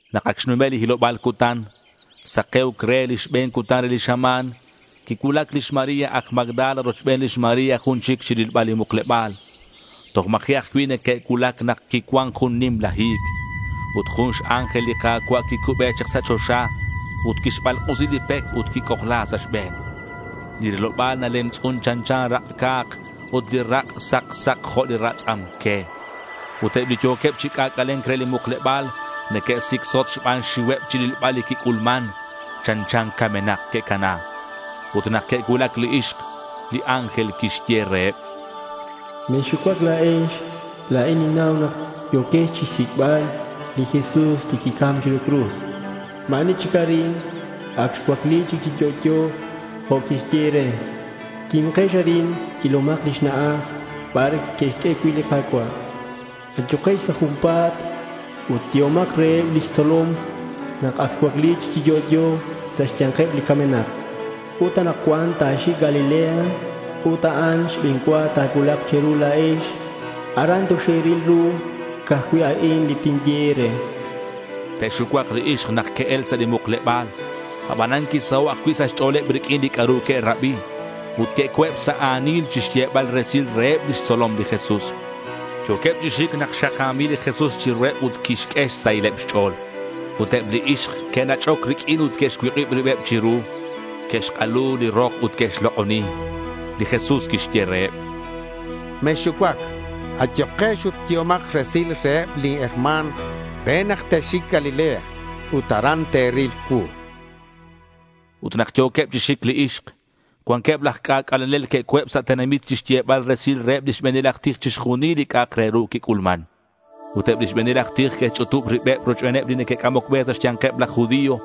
Nak ac xnume' li hiloba̱l cutan, sake̱uc re li xbe̱n cutan re li xama̱n, quicuulac lix María aj Magdala rochben lix María jun chic chirilbal li mukleba̱l. Toj ma̱ji' ajcui' neque'cuulac nak quicuan jun nimla hi̱c. Ut jun x-ángel li Ka̱cua' quicube chak sa' choxa ut quixbalk'usi li pec ut quic'ojla sa' xbe̱n. Li riloba̱l nalemtz'un chanchan rak' ca̱k ut li rak' sak sak jo' li ratz'am que. Ut eb li yo̱queb chi c'ac'ale̱nc re li mukleba̱l neque'sicsot xban xxiuheb chirilbal li quic'ulman. Chanchan camenak que'cana. Ut nak que'cuulac li ixk, li ángel quixye reheb: —Mexxucuac la̱ex. La̱in ninnau nak yo̱quex chixsic'bal li Jesús li quicam chiru cruz. Ma̱ ani chic arin. Ac xcuacli chi yo'yo jo' quixye e̱re. Quimkex arin. Ilomak lix na'aj bar que'xq'ue cui' li Ka̱cua'. Ayukex sa' junpa̱t ut yehomak reheb lix tzolom nak ac xcuacli chi yo'yo sa' xya̱nkeb li camenak. Ut anakcuan ta̱xic Galilea ut a'an xbe̱n cua ta̱cuulak che̱ru la̱ex. Aran toxe̱ril ru. Ca'aj cui' a'in li tinye e̱re, chan li ángel. Te'xucuak li ixk nak que'el sa' li mukleba̱l. Abanan quisaho' ajcui' sa' xch'o̱leb riq'uin li c'a'ru que'rabi. Ut co̱eb sa' a̱nil chixyebal resil reheb lix tzolom li Jesús. Yo̱queb chi xic nak xaka̱mil li Jesús chiruheb ut quixq'ue xsahileb xch'o̱l. Ut eb li ixk que'nach'oc riq'uin ut que'xcuik'ib ribeb chiru. Que'xk'alu li rok ut que'xlok'oni. Li Jesús quixye reheb: —Mexxucuac. Ayukex ut yehomak resil reheb lin herma̱n re nak te'xic Galilea. Ut aran te'ril cuu, chan. Ut nak yo̱queb chi xic li ixk, cuanqueb laj c'ac'alenel que'co̱eb sa' tenamit chixyebal resil reheb lix be̱nil aj tij chixjunil li c'a'ak re ru quic'ulman. Ut lix be̱nil aj tij que'xch'utub ribeb rochbeneb li neque'c'amoc be sa' xya̱nkeb laj judío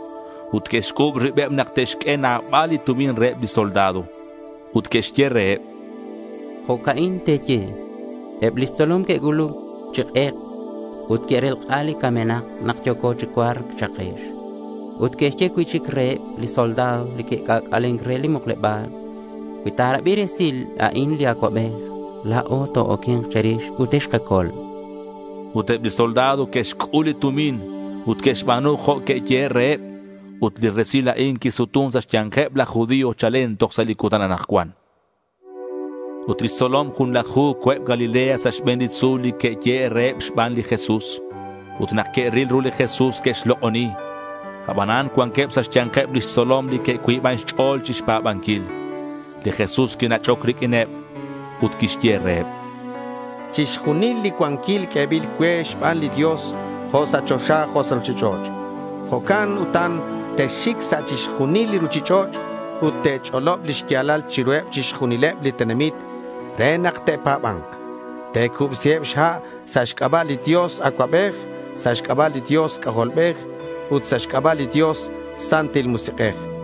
ut que'xc'u̱b ribeb nak te'xq'ue nabal li tumin reheb li soldado. Ut que'xye reheb: —Jo'ca'in te̱ye: “Eb lix tzolom que'cuulac chi k'ek ut que'relk'a li camenak nak yo̱co chi cua̱rc,” cha'kex. Ut que'xye cui'chic reheb li soldado li que'c'ac'alen re li mukleba̱l: —Cui ta̱rabi resil a'in li acuabej, la̱o to-oque̱nk che̱rix ut texkacol, chanqueb. Ut eb li soldado que'xc'ul li tumin ut que'xba̱nu jo' que'yehe' reheb. Ut li resil a'in quisutun sa' xya̱nkeb laj judío chalen toj sa' li cutan anakcuan. Ut lix tzolom junlaju co̱eb Galilea sa' xbe̱n li tzu̱l li que'yehe' reheb xban li Jesús. Ut nak que'ril ru li Jesús, que'xlok'oni. Abanan cuanqueb sa' xya̱nkeb lix tzolom li que'cuiban xch'o̱l chixpa̱banquil. Li Jesús quinach'oc riq'uineb ut quixye reheb: —Chixjunil li cuanquil q'uebil cue xban li Dios, jo' sa' choxa jo' sa' ruchich'och'. Jo'can utan texxic sa' chixjunil li ruchich'och' ut te̱ch'olob li xya̱lal chiruheb chixjunileb li tenamit re nak te'pa̱ba̱nk. Te̱cubsiheb xha' sa' xc'aba' li Dios Acuabej, sa' xc'aba' li Dios C'ajolbej ut sa' xc'aba' li Dios Santil Musik'ej.